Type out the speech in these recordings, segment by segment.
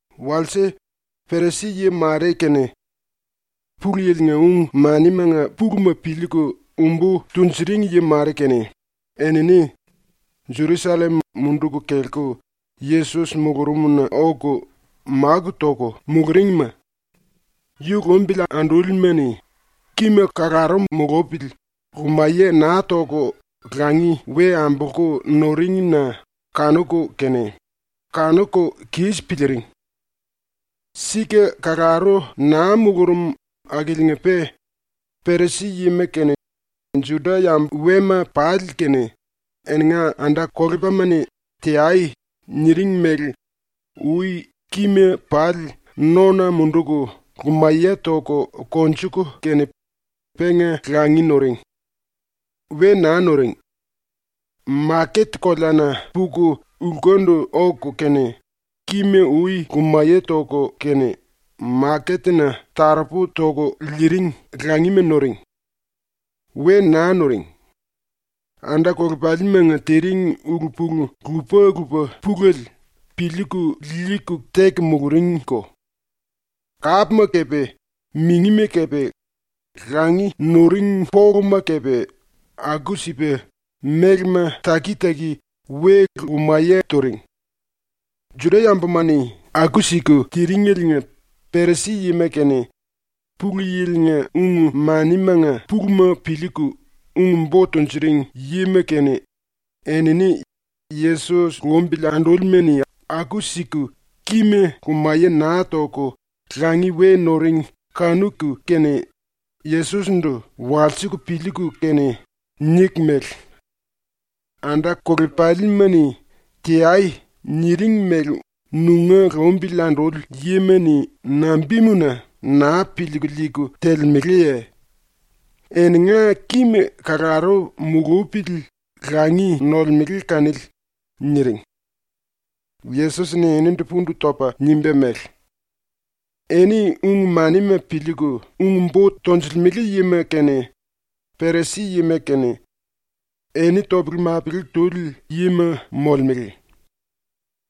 ⸤Walse⸥ Perisi-yi mare kene Pulu Yili-nga ung-manimanga puluma piliiku ung-bo tunjuring yi mare kene enini Jerusallem munduku kelku Yesos mulurumna oku máku toku muluringma yu lumbili andúlima-ni kima kalaru mulupili lumaye naa toku langi we ambolku nuring-na kanuku kene kanuku kis piliiring. (⸤Sika kalaru naa mulurum akiliinga-pe⸥ Perisi yima kene Juda-yambu wema pali kene eninga anda-kolepalima-ni “Teai.” niring mele ui kima pali nona munduku lumaye toku konjuku kene penga langi nuring. We naa nuring. Maket-koleana puku lkundu oku kene kima ui lumaye toku kene ⸤maketna taropu toku liiring⸥ langima nuring. We naa nuring. Anda-kolepalimanga tiring ulu-pulu lupa-lupa pulele piliiku liiku teku muluringko. Kápma kepe, mingima kepe, langi nuring poluma kepe, aku-sipa mélema taki-taki we lumaye turing.) ⸤Juda-yambuma-ni aku-siku tiring⸥eliinga Perisi-yima kene, Pulu Yili-nga ung-manimanga puluma piliiku ung-bo tunjuring yima kene, enini ⸤Yesos lumbili andúlima-ni aku-siku kima lumaye naa toku langi we nuring kanuku kene⸥ Yesos-ndu walsiku piliiku kene niku mele: “Anda-kolepalima-ni “Teai.” niring mele nunga lumbili anduli yima-ni nambimuna naa piliiku liiku telemeleye? Eninga kima kalaru mulupili langi nolemele kanili.” niring. Yesos-ni eninindu pundu topa nimba mele: “Eni ⸤ung-manima piliiku ung-bo tonjilimele yima kene Perisi-yima kene⸥ eni topele-mapele tuli yima molemele!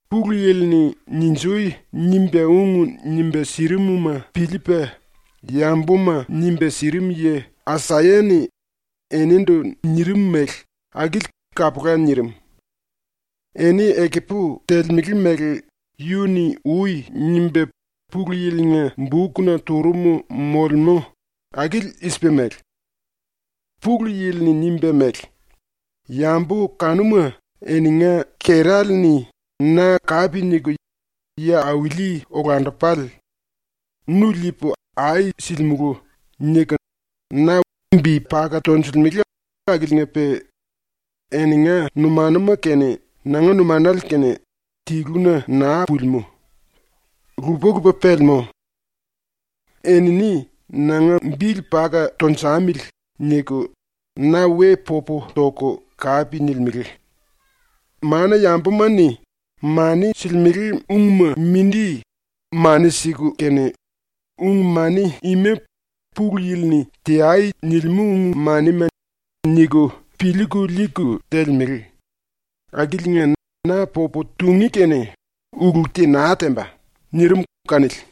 Pulu Yili-ni “Ninji!” nimba ung nimba sirimuma piliipa yambuma nimba sirim yi Asaya-ni enindu nirim mele akili kapula nirim. ⸤Eni ekupu telemele mele yu-ni ui nimba Pulu Yili-nga⸥ bukna turum molemú akili i-sipa mele: ‘⸤Pulu Yili-ni nimba mele:⸥ “Yambu kanuma eninga kerale-ni na kape niku ‘Yi-auli-olandupale. Nu liipu ai silimulu.’ niku na bi paka tonjilimele akiliinga-pe eninga numanuma kene nanga numanale kene tiluna naa pulimú. Lupa-lupa pelemú. Enini ‘Nanga bili paka tunjamili.’ niku na we popu toku kape nilimele. Mana-yambuma-ni mani silimele ungma mindi mani siku kene ‘Ung-mani ima Pulu Yili-ni “Teai.” nilimú ung-manima.’ niku piliiku liiku telemele, akiliinga na popu tungí kene ulu te naa temba.” ⸤nirim⸥’ kanili.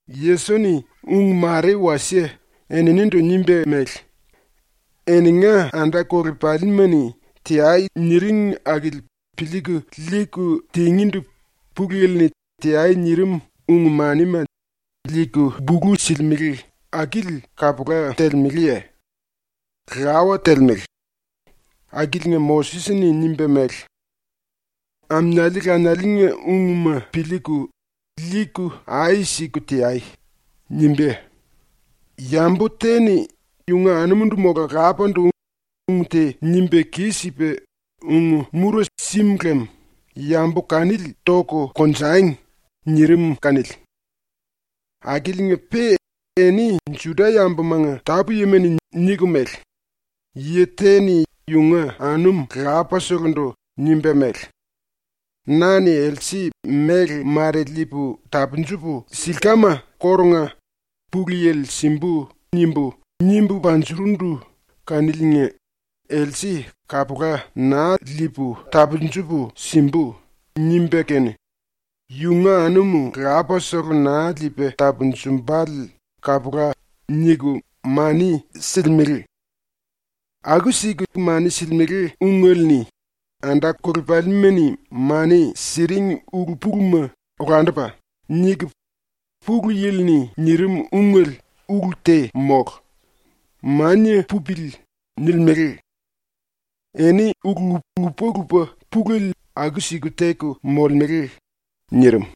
⸤Yesos-ni⸥ ung mare wasie eninindu nimba mele: “Eninga anda-kolepalima-ni “Teai.” niring akili piliiku liiku tingíndu Pulu Yili-ni “Teai.” nirim ung-manima liiku bulu silimele akili kapula telemeleye? ⸤Lawa telemele.⸥ Akiliinga Moses-ni nimba mele: “Aminiali lanialinga ungma piliiku, liiku ai siku teai.” nimba “Yambu te-ni yunga anumundu mola lapandu ung te nimba kis-sipa ung-mura sim lem yambu kanili toku konjangi.” nirim kanili. Akiliinga-pe eni ⸤Juda-yambumanga tápu-yima⸥ -ni niku mele: “Yi te-ni yunga anum lapaselendu nimba mele: “Na-ni else méle mare liipu tapunjupu silkama kórunga ‘Pulu Yili simbu.’ nimbu, nimbu panjurundu kaniliinga else kapula naa liipu tapunjupu simbu.” nimba kene yunga anum lapasele naa liipa tapunjumbale kapula.” niku mani silimele. Aku-siku mani silimele ungele-ni ‘Anda-kolepalima-ni mani siring ulu-puluma olandupa.’ niku ‘Pulu Yili-ni nirim ungele ulu te mólu. Mania pupili.’ nilimele. Eni ulu lupa-lupa pulele aku-siku teku molemele.” nirim.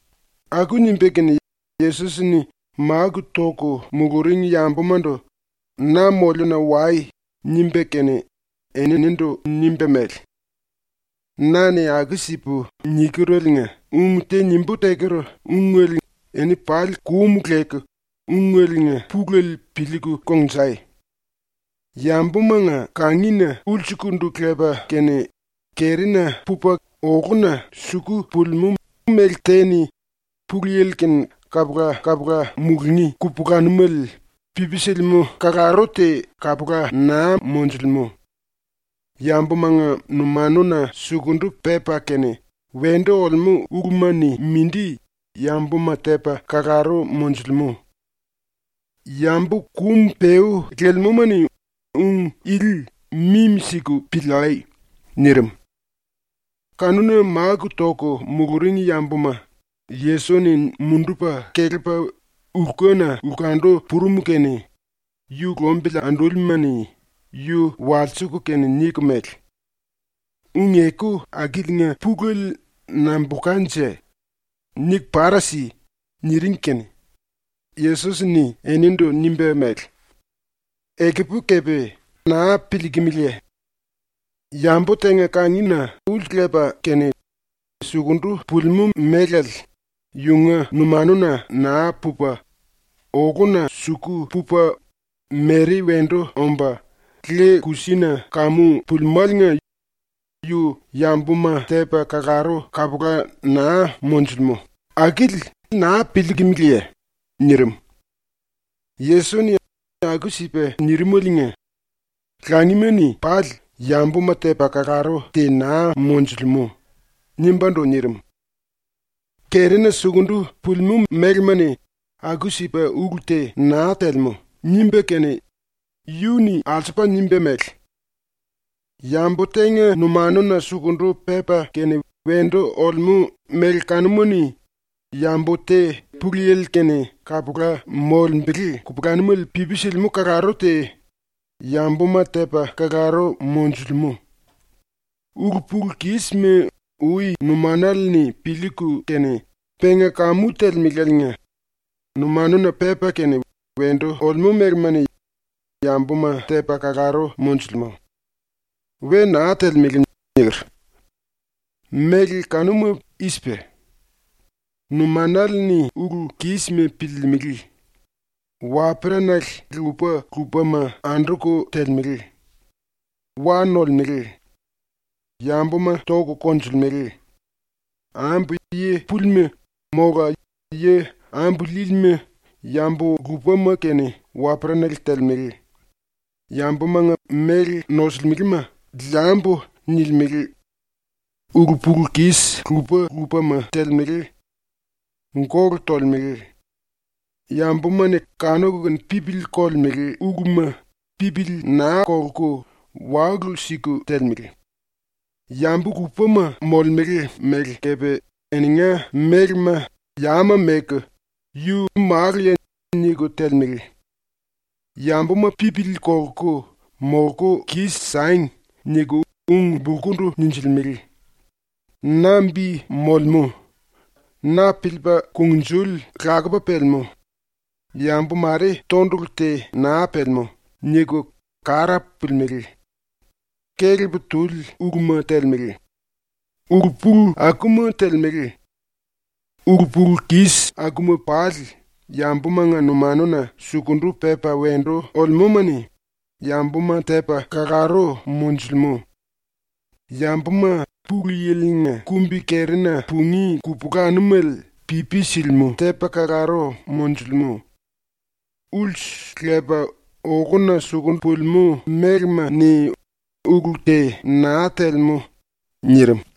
Aku nimba kene Yesos-ni máku toku muluring yambumandu “Na moliuna wai.” nimba kene eninindu nimba mele: “Na-ni ⸤aku-sipu nikereliinga ung te⸥ nimbú teker ungele eni pali kum leku ungeliinga pulele piliiku kongnjai. Yambumanga kangina ulsukundu lepa kene kerina pupa oluna suku pulimú méle te-ni ⸤Pulu Yili-kene kapula-kapula mulungí kupulanumele pipi silimú⸥ kalaru te kapula naa monjulemú. Yambumanga numanuna sukundu pepa kene wendu olemú uluma-ni mindi yambuma tepa kalaru monjulimú. (Yambu kum-peú lelemúma-ni ung ili mimi-siku piliai.” nirim.) Kanuna máku toku muluring yambuma Yesos-ni mundupa kelepa lkuna lkundu purum kene yu lumbili andúlima-ni yu walsiku kene niku mele: “Ung-eku akiliinga pulele nambulkanje? Niku para si.” niring kene Yesos-ni eninindu nimba mele: “Ekupu kepe naa piliikimiliye? Yambu tenga kangina ulsu lepa kene sukundu pulimú mélale yunga numanuna naa pupa, oluna suku pupa mere wendu omba le-kusina kamu pulimáliinga yu yambuma tepa kalaru kapula naa monjulimú akili naa piliikimiliye?” nirim. (Yesos-ni aku-sipa nirimaliinga “Langima-ni pali yambuma tepa kalaru te naa monjulemú.” nimbándu nirim.) ⸤“Kerina sukundu pulimú mélema-ni aku-sipa ulu te naa telemú.” nimba kene⸥ yu-ni alsupa nimba mele: “Yambu tenga numanuna sukundu pepa kene wendu olemú méle kanuma-ni yambu te ⸤Pulu Yili-kene kapula molembele kupulanumele pipi silimú⸥ kalaru te yambuma tepa kalaru monjulemú. Ulu-pulu-kisma ui numanale-ni piliiku kene ⸤penga kamu telemeláliinga⸥ “Numanuna pepa kene wendu olemú mélema-ni yambuma tepa kalaru monjulemú. ⸤We naa telemele.⸥” ⸤niker.⸥ Méle kanuma i-sipa: Numanale-ni ulu-kísima piliilimili; waperanale lupa-lupama anduku telemele; wa nolemele; yambuma toku konjulemele; ambu yi púlima mola yi ambu líílima yambu lupama kene waperanale telemele; yambumanga méle nosulimelema ‘Liambu.’ nilimele; ulu-pulu-kis lupa-lupama telemele; gólu tolemele; yambuma-ni kanuku kene pipili kolemele uluma pipili naa kolku walu siku telemele; yambu lupama molemele mele kepe eninga mélema yama meku ‘Yu maluya.’ niku telemele; ‘Yambuma pipili kolku molku kis-sangi.’ niku ung-bulkundu ninjilimele; ‘Na bi molemú. Na piliipa kungnjuli lakupa pelemú. Yambu mare tondulu te naa pelemú.’ niku kara pulimelé; kelep tuli uluma telemele; ulu-pulu akuma telemele. Ulu-pulu-kis akuma pali yambumanga numanuna sukundu pepa wendu olemúma-ni yambuma tepa kalaru monjulemú, yambuma ⸤Pulu Yili-nga kumbi-kerina pungí kupulanumele pipi silimú⸥ tepa kalaru monjulimú. ⸤Ulsu lepa oluna suku pulimú mélema-ni ulu te naa telemú.⸥” nirim.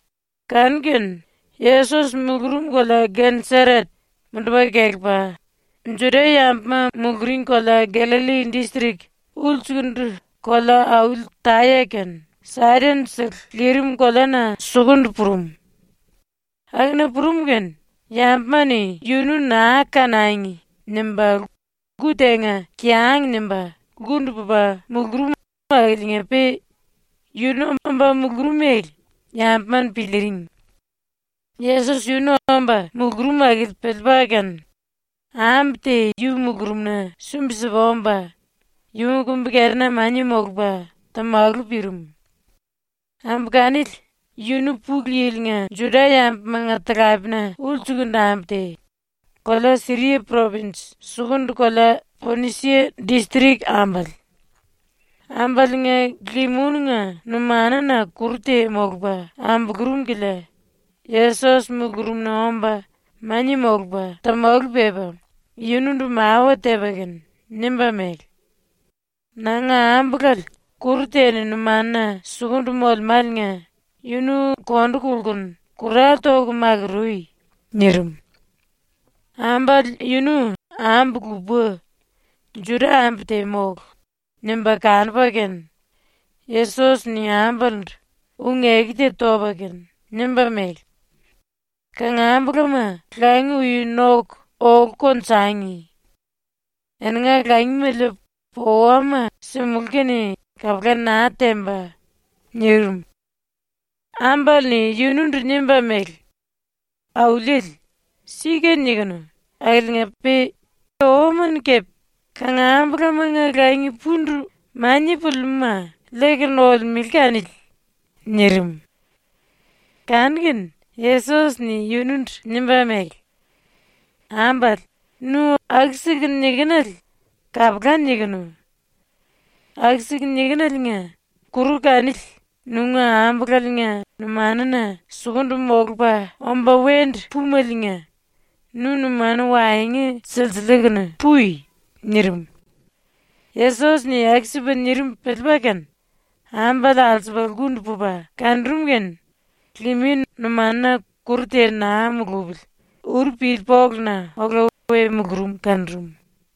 Kanu-kene Yesos mulurum kolea ⸤Geneseret⸥ mundupa kelepa ⸤Juda-yambuma muluring kolea Gallalli distrik ulsukundu⸥ kolea-auli Taya kene Saidon-sele lirim koleana sukundu purum. Akuna purum kene yambuma-ni yunu ‘naa kanangi.’ nimba lku tenga ⸤kiang nimba⸥ lkundu pupa mulurum akiliinga-pe yunu omba mulurum mele yambuma-ni piliiring. Yesos yunu omba mulurum akili piliipa kene ambu te yu mulurumna sumbi-sipa omba yunga kumbi-kerina mania molupa tamalu pirim. Ambu kanili yunu ⸤Pulu Yili-nga⸥ Juda-yambumanga talapena ulsukundu ambu te, kolea Siria propinj sukundu kolea Ponisia distrik ambale. Ambaliinga liminunga numanuna kuru te molupa ambulurum kilia Yesos mulurumna omba mania molupa tamalu pepa yunundu mawa tepa kene nimba mele: “Nanga ambulale kuru te numanuna sukundu molemáliinga yunu ⸤kondu kolkunu⸥ kurale toku makurui.” nirim. ⸤Ambale yunu ambu lupa, Juda-ambu te mólu, nimba kanupa kene⸥ Yesos-ni ambalendu ⸤ung-eku te topa kene⸥ nimba mele: “Kangambulama langi ui noku olu konjangi. Eninga langima liipu owama simulú kene kapula naa temba.” nirim. Ambale-ni yunundu nimba mele: “Auliele, sika nikinu akiliinga-pe owama-ni kepe kangambulamanga langi pundu mania pulimúma liiku nolemele kanili.” nirim. Kanu-kene Yesos-ni yunundu nimba mele: “Ambale, nu aku-siku nikinele kapula nikinu. Aku-siku nikineliinga kuru kanili nunga ambulaliinga numanuna sukundu molupa omba wendu púmeliinga nu ⸤numanu waengu silsiliiku⸥ pui.” nirim. ⸤Yesos-ni aku-sipa nirim piliipa kene⸥ ambale alsupa lkundu pupa kanurum kene limin numanuna kuru te naa mulupili uru pili poluna ola we mulurum kanurum.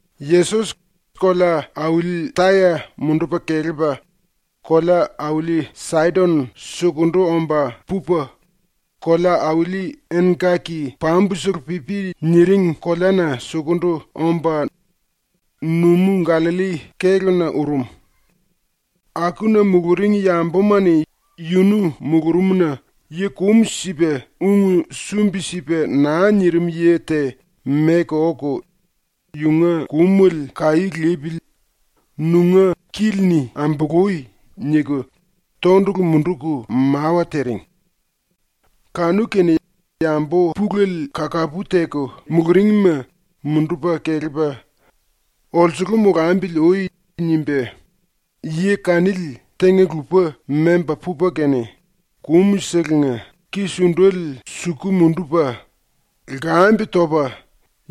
Yesos kolea-auli Taya mundupa kelepa kolea-auli Saidon sukundu omba pupa, ‘Kolea-Auli Engkaki Pambusele-Pipi’ niring koleana sukundu omba, numú-Gallalli kéluna urum. Akuna muluring yambuma-ni yunu mulurumna yi kum sipa ung sumbi-sipa naa nirim yi te meku oku “⸤Yunga kumele kaí lipili⸥ nunga kili-ni ambului.” niku tondulu munduku mawa tiring. Kanu-kene yambu pulele kakapu teku muluringma mundupa kelepa “Olsulu molambili ui.” nimba yi kanili tenga-lupa memba pupa kene, kúmselenga ki-sundele suku mundupa, lkambe topa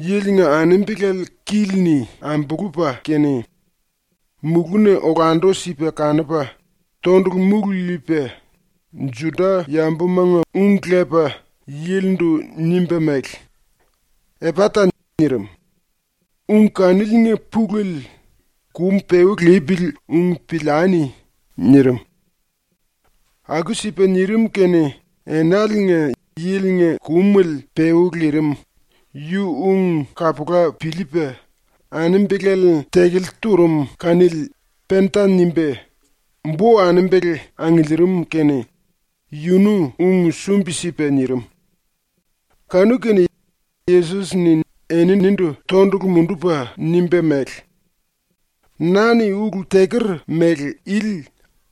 yilinga anembelale kili-ni ambulupa kene, mulúna olandu-sipa kanupa, tondulu múlu liipa, Juda-yambumanga ung lepa yilindu nimba mele: “Epata!” nirim. (Ung kaniliinga pulele “Kum-peú lipili ung piliani!” nirim.) Aku-sipa nirim kene enaliinga yilinga kumele peú lirim, yu ung kapula piliipa, anembelale tekele turum kanili penta nimba bo-anembele angiliirim kene yunu ung sumbi-sipa nirim. Kanu-kene Yesos-ni eninindu tondulu mundupa nimba mele: “Na-ni ulu teker mele ili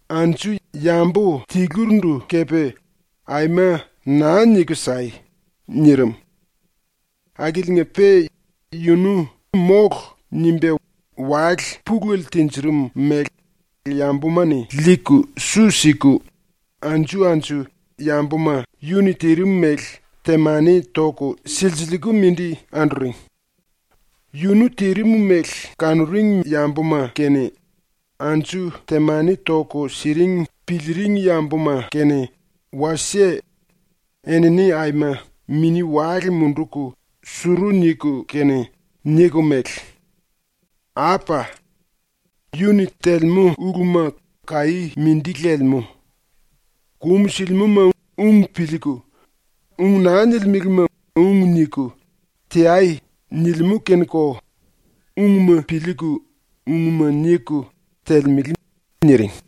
anju yambu tilurindu kepe aima naa niku sai!” nirim. Akiliinga-pe yunu “Mólu.” nimba wale pulele tinjirim mele yambuma-ni liiku su siku anju-anju yambuma yu-ni tirim mele temani toku silsiliiku mindi anduring. ⸤Yunu tirim mele kanuring yambuma kene, anju temani toku siring piliiring yambuma kene wasie⸥ enini aima mini-wale munduku suru niku kene niku mele: “Apa! Yu-ni telemú uluma kaí mindi lelemú. “Kúmu silimúma ung piliiku, ung naa nilimelema ung niku, teai.” nilimú kene-ko ungma piliiku ungma niku telemele.” niring.